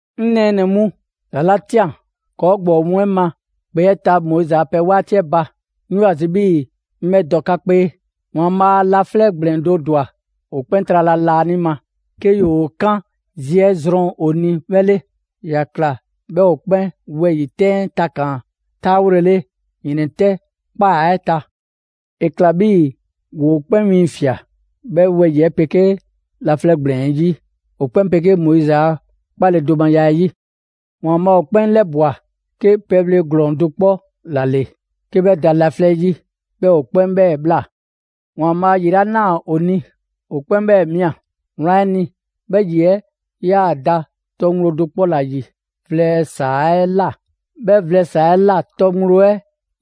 'Ŋ nɛɛnɛ‑ mu, ‑za 'la ꞊tian ‑kɔɔ' ‑gbɔɔ mu 'ɛ ma ‑kpe 'ɛ ta Moizi a pɛ 'waati 'ɛ ba, 'ŋ 'yoo‑ ‑a zi 'bhii‑ 'ŋ 'bhɛ dɔ 'ka 'kpee. ‑Waanbhaa' laflɛ' ‑gblɛn do ‑dwa ‑o 'kpɛn trala laanima, 'ke ‑yoo ‑o 'kan zi 'ɛ zrɔn ‑o ni 'bhɛ 'le. ‑Ya ꞊kla 'bhɛɛ‑ ‑o 'kpɛn wɛyi‑ 'tɛn 'ɛ takaan‑ 'taawolele ‑yrɛntrɛ' ‑kpaa 'ɛ ta. ‑E ‑kla 'bhii‑ ‑woo 'kpɛn 'wiiŋfia꞊ 'bhɛ wɛyi‑ 'ɛ 'pegee laflɛ' ‑gblɛn 'ɛ 'yi, ‑o 'kpɛn 'pegee Moizi a 'kpaledomaya 'ɛ 'yi. ‑Waanbhaa' ‑o 'kpɛn ‑lɛbwa 'ke pɛbhle ‑glɔɔn do 'kpɔ ‑la ‑le 'ke 'bhɛ da laflɛ 'yi, 'bhɛɛ‑ ‑o 'kpɛn 'bhɛ ꞊bhla. ‑Waanbhaa' ‑yi 'la ꞊naa ‑o ni, ‑o 'kpɛn 'bhɛɛ‑ ꞊mia. Wlan 'ɛ ni, 'bhɛ ‑yi 'ɛ 'yaa‑ da tɔ ŋgblo do 'kpɔ ‑la ‑yi vlɛ ‑saa 'ɛ ꞊la, 'bhɛ vlɛ ‑saa 'ɛ ꞊la tɔ ŋgblo 'ɛ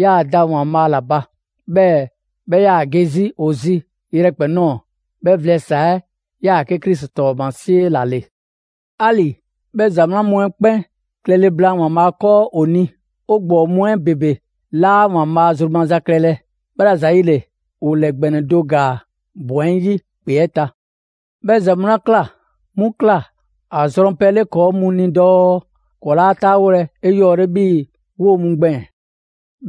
'yaa‑ da ‑Waanbhaa' ‑la ba. 'Bhɛɛ‑ 'bhɛ 'yaa‑ ge 'zi ‑o zi yrɛkpɛn‑ ꞊nɔɔ. 'Bhɛ vlɛ ‑saa 'ɛ‑ 'yaa‑ 'ke Krisi 'tɔɔmasie ‑la ‑le. 'Ali‑ 'bhɛ ‑za 'wlan mu 'ɛ 'kpɛn klɛle blaan ‑Waanbhaa' 'kɔɔ ‑o ni, 'o ‑gbɔɔ mu 'ɛ ‑bebe 'laa ‑Waanbhaa' zru maza klɛlɛ. 'Bhɛla‑ ‑zayile, ‑o ‑lɛ ‑gbɛnɛ do ‑gaa ‑bɔn 'ɛ 'yi ‑kpe 'ɛ ta. 'Bhɛ ‑za mu 'la ꞊kla 'mu ꞊kla ‑a zrɔnpɛ 'le ‑kɔɔ' mu ni dɔɔ ‑kɔɔ' 'laa 'taawolɛ 'eyɔɔle 'bhii‑ 'woo‑ mu gbɛɛn‑.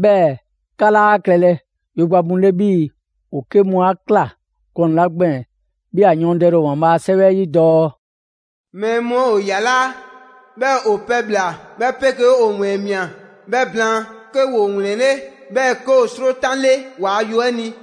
'Bhɛɛ‑ 'ka 'laa klɛlɛ yogba mu 'le 'bhii‑ ‑o 'ke mu 'a ꞊kla gɔnɛ‑ 'la gbɛɛn‑ 'bhii‑ ‑a yɔɔndɛle ‑o ‑Waanbhaa' a 'Sɛwɛ 'ɛ 'yi dɔɔ: «Mɛɛ mu 'ɛ ‑o ‑yalaa', 'bhɛɛ‑ ‑o pɛbhla‑ 'bhɛ 'pegee ‑o ‑wɛɛn ꞊mia. 'Bhɛ blaan, 'ke ‑woo ‑wlɛnle', 'bhɛɛ‑ 'ke ‑o 'srotanle waa yo 'ɛ ni.»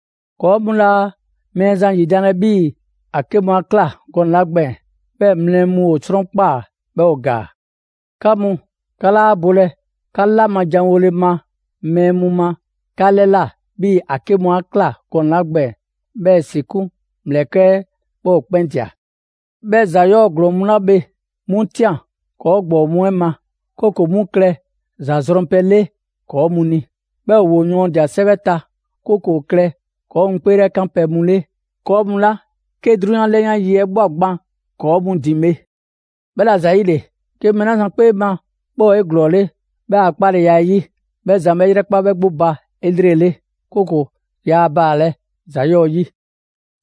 ‑Kɔɔ' mu 'laa Mɛɛzan ‑yidanlɛ 'bhii‑ ‑a 'ke mu 'a ꞊kla gɔnɛ‑ 'la gbɛɛn‑. 'Bhɛɛ‑ mlɛ mu ‑o 'sɔnkpaa‑, 'bhɛɛ‑ ‑o ‑gaa. 'Ka mu, 'ka 'laa bolɛ 'ka 'la ma janwole ma mɛɛ mu ma 'ka 'lɛ ꞊la, 'bhii‑ ‑a 'ke mu 'a ꞊kla gɔnɛ‑ 'la gbɛɛn‑ 'bhɛɛ‑ ‑si 'kun ‑mlɛkɛ' 'ɛ 'bhɛ ‑o 'kpɛn ꞊dia. 'Bhɛ ‑za 'yɔɔ‑ ‑glɔɔn mu 'la bhe, 'mu ꞊tian ‑kɔɔ' ‑gbɔɔ mu 'ɛ ma, 'kooko‑ 'mu klɛ ‑za zrɔnpɛ 'le ‑kɔɔ mu ni. 'Bhɛɛ‑ ‑woo yɔɔndia‑ 'sɛwɛ ta, 'kooko‑ ‑o klɛ ‑kɔɔ' mu 'kpeelɛkanpɛ mu 'le, ‑kɔɔ' mu 'la 'ke 'drunyan 'lɛyan yi 'ɛ ꞊bhwa gban ‑kɔɔ' mu ‑din bhe. 'Bhɛla‑ ‑zayile, 'ke mɛɛ 'la zan 'kpee ma 'bhɛ ‑o 'eglɔɔle 'bhɛ a 'kpaleya 'ɛ 'yi, 'bhɛ zan 'bhɛ 'yrɛkpa 'bhɛ 'gbu ba 'elrele; 'kooko‑ yaa baalɛ ‑za 'yɔɔ‑ 'yi.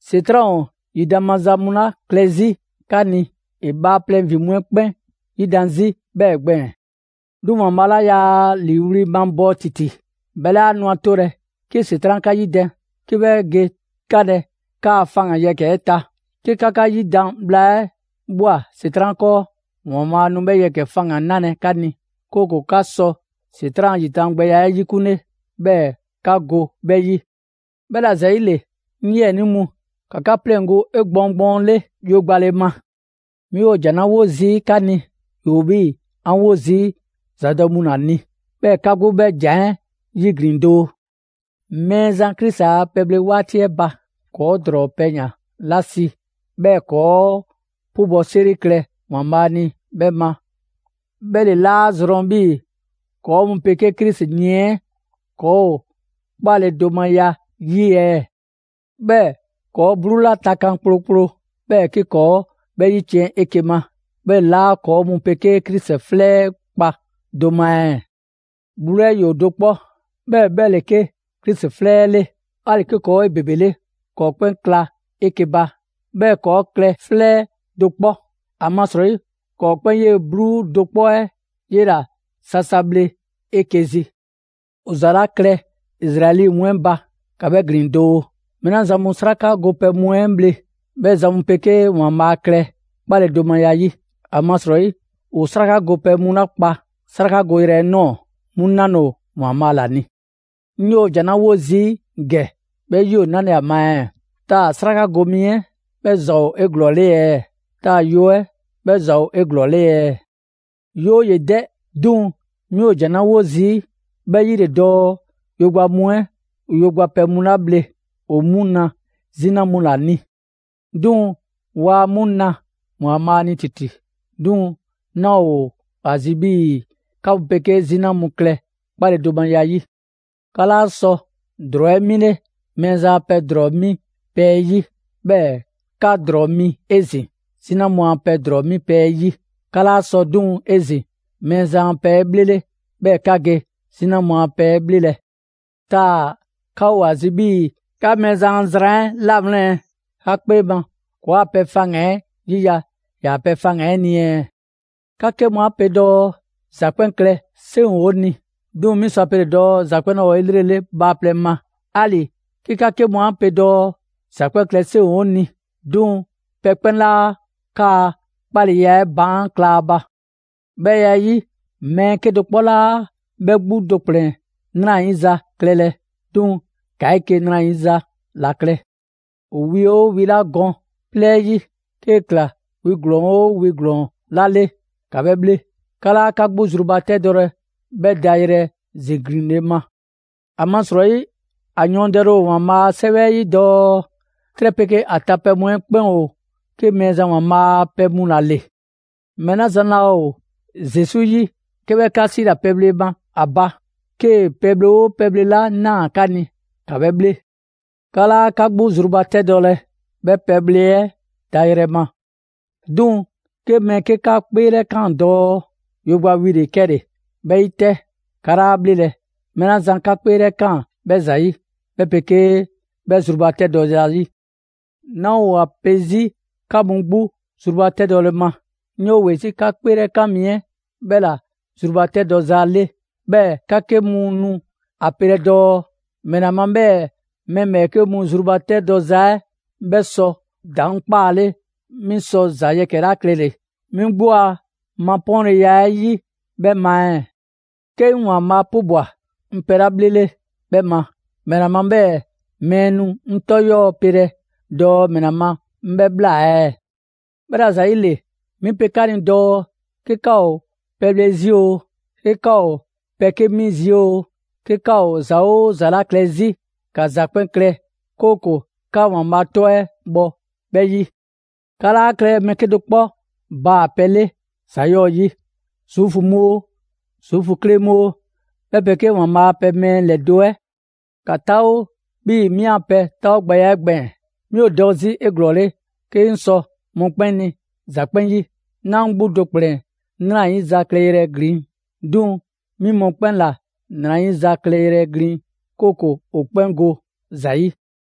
‑Setran' ‑o ‑yidan' maza mu 'la klɛ 'zi 'ka ni, ‑e bhaaplɛŋ ‑vin mu 'ɛ 'kpɛn 'yidan‑ 'zi 'bhɛɛ‑ gbɛɛn‑. 'Duŋ‑ ‑Waanbhaa' 'la yaa ‑liiwli' mabɔɔ ‑titi, 'bhɛ 'laa nu ‑a 'tolɛ‑ 'ke ‑Setran' 'ka 'yidan‑ 'ke 'bhɛ ge 'kanlɛ‑ 'kaa‑ faŋgan‑ yɛkɛ‑ 'ɛ ta. 'Ke 'ka 'yidan‑ bhla 'ɛ ꞊bhwa ‑Setran' 'kɔɔ, ‑Waanbhaa' nu 'bhɛ yɛkɛ‑ faŋgan‑ 'nalɛ‑ 'ka ni, 'kooko‑ 'ka sɔ ‑Setran' a ‑yidangbɛya 'ɛ 'yikunle, 'bhɛɛ‑ 'ka go 'bhɛ 'yi. 'Bhɛla‑ ‑zayile, 'ŋ 'yiɛnii mu, ‑ka 'ka 'pleŋgo‑ 'egbɔɔn gbɔɔnle‑ yogbale ma. 'Mi ‑o ‑jan 'la 'wo zii' 'ka ni, ‑yoo 'bhii‑ 'an wo zii' ‑zadɔ' mu ‑la ni. 'Bhɛɛ‑ 'ka 'gbu 'bhɛ ‑jan 'ɛ 'yiglin‑ doo. Mɛɛzan Krisi a pɛbhle 'waati 'ɛ ba, ‑kɔɔ' ‑drɔɔ pɛyan‑ 'la si 'bhɛɛ‑ ‑kɔɔ' 'pubɔ‑ 'seri klɛ ‑Waanbhaa' ni 'bhɛ ma 'bhɛ ‑le 'laa zrɔn 'bhii‑ ‑kɔɔ' mu 'pegee Krisi yiɛn 'ɛ ‑kɔɔ ‑o 'kpaledomaya 'yi ɛɛ? 'Bhɛɛ‑ ‑kɔɔ' 'bluu 'la takan kplokplo, 'bhɛɛ‑ 'ke ‑kɔɔ' 'bhɛ 'yiciɛn‑ 'eke‑ ma, 'bhɛ ‑le 'laa ‑kɔɔ' mu 'pegee Krisi 'flɛ 'ɛ kpa do ma ɛɛ? 'Bluu 'ɛ ‑yoo do 'kpɔ, 'bhɛɛ‑ 'bhɛ ‑le 'ke Krisi 'flɛ 'ɛ 'le. 'Ali‑ 'ke ‑kɔɔ' ‑o 'ebebele, ‑kɔɔ' 'kpɛn kla 'eke‑ ba, 'bhɛɛ‑ ‑kɔɔ' klɛ 'flɛ do 'kpɔ. ‑Amasrɔyi ‑kɔɔ' 'kpɛn 'yee‑ 'bluu do 'kpɔ 'ɛ 'yela‑ sasa bhle 'eke‑ zi. ‑O ‑za 'la klɛ Izraɛli mu 'ɛ ba, ‑ka 'bhɛ ‑glin doo: mɛɛ 'la zan mu 'sraka gopɛ mu 'ɛ bhle, 'bhɛ zan mu 'pegee ‑Waanbhaa' klɛ 'kpaledomaya 'yi. ‑Amasrɔyi ‑o 'sraka gopɛ mu 'la kpa 'srakagoyrɛ 'ɛ ꞊nɔɔ, 'mu 'nale‑ ‑o ‑Waanbhaa' ‑la ni. 'Ŋ 'yoo‑ ‑jan 'la 'wo zii' ‑gɛ 'bhɛ 'yi ‑o 'nale‑ ‑a ma ɛɛ? Taa‑ 'sraka go wi 'ɛ 'bhɛ ‑za ‑o 'eglɔɔle ɛɛ? Taa‑ yo 'ɛ 'bhɛ ‑za ‑o 'eglɔɔle ɛɛ? 'Yooye‑ 'dɛ! 'Duŋ‑ 'mi ‑o ‑jan 'la 'wo zii', 'bhɛ 'yi ‑le dɔɔ yogba mu 'ɛ, ‑o yogba pɛ mu 'la bhle, ‑o 'mu na 'zina mu ‑la ni; 'duŋ‑ ‑ waa ‑o 'mu 'na Waanbhaa' ni ‑titi. 'Duŋ‑ 'naa‑ ‑o ‑a zi 'bhii‑ 'ka mu 'pegee 'zina mu klɛ 'kpaledomaya 'yi. 'Ka 'laa sɔ ‑drɔɔ 'ɛ 'mile Mɛɛzan a pɛ ‑drɔɔ 'mi pɛ 'ɛ 'yi, 'bhɛɛ‑ 'ka ‑drɔɔ mi 'ezin‑ 'zina mu a pɛ ‑drɔɔ 'mi pɛ 'ɛ 'yi. 'Ka 'laa sɔ 'duŋ‑ 'ezin‑ Mɛɛzan a pɛ 'ɛ 'bhlele, 'bhɛɛ‑ 'ka ge 'zina mu a pɛ 'ɛ 'bhlelɛ. Taa‑ 'ka ‑o ‑a zi 'bhii‑ 'ka Mɛɛzan a zran 'ɛ 'lawlɛn‑ ɛɛ? 'Ka 'kpee ma, ‑kɔɔa' pɛ faŋgan‑ 'ɛ 'yiya‑ ‑yaa' pɛ faŋgan‑ 'ɛ ni ɛɛ? 'Ka 'ke mu a pe dɔɔ: «‑Za 'kpɛn klɛ 'seŋ ‑o 'o ni». 'Duŋ‑ 'mi sɔ ‑a pele dɔɔ ‑za 'kpɛn 'laa ‑o 'elrele bhaaplɛŋ ma. 'Ali‑ 'ke 'ka 'ke mu 'a pe dɔɔ: «‑Za 'kpɛn klɛ 'seŋ ‑o 'o ni». 'Duŋ‑ pɛ 'kpɛn 'laa 'kaa‑ 'kpaleya 'ɛ baan' kla a ba. 'Bhɛ ya 'ɛ 'yi, mɛɛ 'kedo‑ 'kpɔ 'laa 'bhɛ 'gbu do ‑kplɛn 'nrayiza klɛlɛ, 'duŋ‑ ‑ka 'eke‑ ‑nrayiza ‑la klɛ. ‑O wi 'oo wi 'la gɔn 'plɛɛ 'yi, 'kee‑ ‑kla wi ‑glɔɔn 'oo wi ‑glɔɔn 'la 'le, ‑ka 'bhɛ bhle. 'Ka 'laa 'ka 'gbu zrubatɛdɔlɛ 'bhɛ dayrɛ ziglinle ma. ‑Amasrɔyi ‑a yɔɔndɛle ‑o ‑Waanbhaa' a 'Sɛwɛ 'ɛ 'yi dɔɔ: «'Trɛ 'pegee ‑a ta pɛ mu 'ɛ 'kpɛn ‑o 'ke Mɛɛzan ‑Waanbhaa' a pɛ mu ‑la ‑le.» Mɛɛ 'la zan laa ‑o Zesu 'yi 'ke 'bhɛ 'ka 'siila‑ pɛbhle ma ‑a ba, 'kee‑ pɛbhle 'oo pɛbhle 'la ꞊naa 'ka ni, ‑ka 'bhɛ 'bhle. 'Ka 'laa 'ka 'gbu zrubatɛdɔlɛ 'bhɛ pɛbhle 'ɛ dayrɛ ma. 'Duŋ‑ 'ke mɛɛ 'ke 'ka 'kpeelɛkaan dɔɔ: «Yogba wi ‑le 'kɛle‑». 'Bhɛ 'yi 'tɛ, 'ka 'laa 'a 'bhlelɛ‑, mɛɛ 'la zan 'ka 'kpeelɛkaan 'bhɛ ‑zayi', 'bhɛ 'pegee 'bhɛ zrubatɛdɔ zayi'. 'Naa ‑o ‑a pe 'zi 'ka mu 'gbu zrubatɛdɔle ma, 'ŋ 'yoo‑ ‑we 'zi 'ka 'kpeelɛkan mi 'ɛ 'bhɛ ‑la zrubatɛdɔza 'le. 'Bhɛɛ‑ 'ka 'ke mu nu a pelɛ dɔɔ: «‑Mɛla ma 'bhɛɛ‑ mɛɛ ‑bhɛɛke' zrubatɛdɔza 'ɛ 'bhɛ sɔ ‑daŋ' 'kpaale 'mi sɔ ‑za yɛkɛ‑ 'la klɛle‑ 'mi 'gbu a mapɔɔnleya 'ɛ 'yi 'bhɛ ma ɛɛ? 'Ke 'ŋ ‑Waanbhaa' 'pubwa‑ 'ŋ pɛ 'la 'bhlele 'bhɛ ma, ‑mɛla ma 'bhɛɛ‑ mɛɛ nu 'ŋ 'tɔ 'yɔɔ‑ 'pelɛ‑ dɔɔ ‑mɛla ma 'ŋ 'bhɛ ꞊bhla ɛɛ?» 'Bhɛla‑ ‑zayile, 'mi pe 'ka ni dɔɔ 'ke 'ka ‑o pɛbhle 'zi oo, 'ke 'ka ‑o pɛ 'ke mi 'zi oo, 'ke 'ka ‑o ‑za 'oo ‑za 'la klɛ 'zi, ‑ka ‑za 'kpɛn klɛ 'kooko‑ 'ka ‑Waanbhaa' 'tɔ 'ɛ bhɔ 'bhɛ 'yi. 'Ka 'laa klɛlɛ mɛɛ 'kedo‑ 'kpɔ baa‑ pɛ 'le ‑za 'yɔɔ‑ 'yi: Zuufu mu oo, Zuufu kle mu oo, 'bhɛ 'pegee ‑Waanbhaa' a pɛ mɛɛ ‑lɛdo' 'ɛ. ‑Ka 'taawo 'bhii‑ 'mi a pɛ 'taawogbɛya 'ɛ gbɛɛn‑: 'mi ‑o dɔ 'zi 'eglɔɔle 'ke 'ŋ sɔ mɔkpɛn' ni ‑za 'kpɛn 'yi. 'Naa 'ŋ 'gbu do ‑kplɛn 'nrayiza klɛyrɛ glin, 'duŋ‑ 'mi mɔkpɛn' ‑la 'nrayiza klɛ yrɛ glin, 'kooko‑ ‑o 'kpɛn go ‑za 'yi.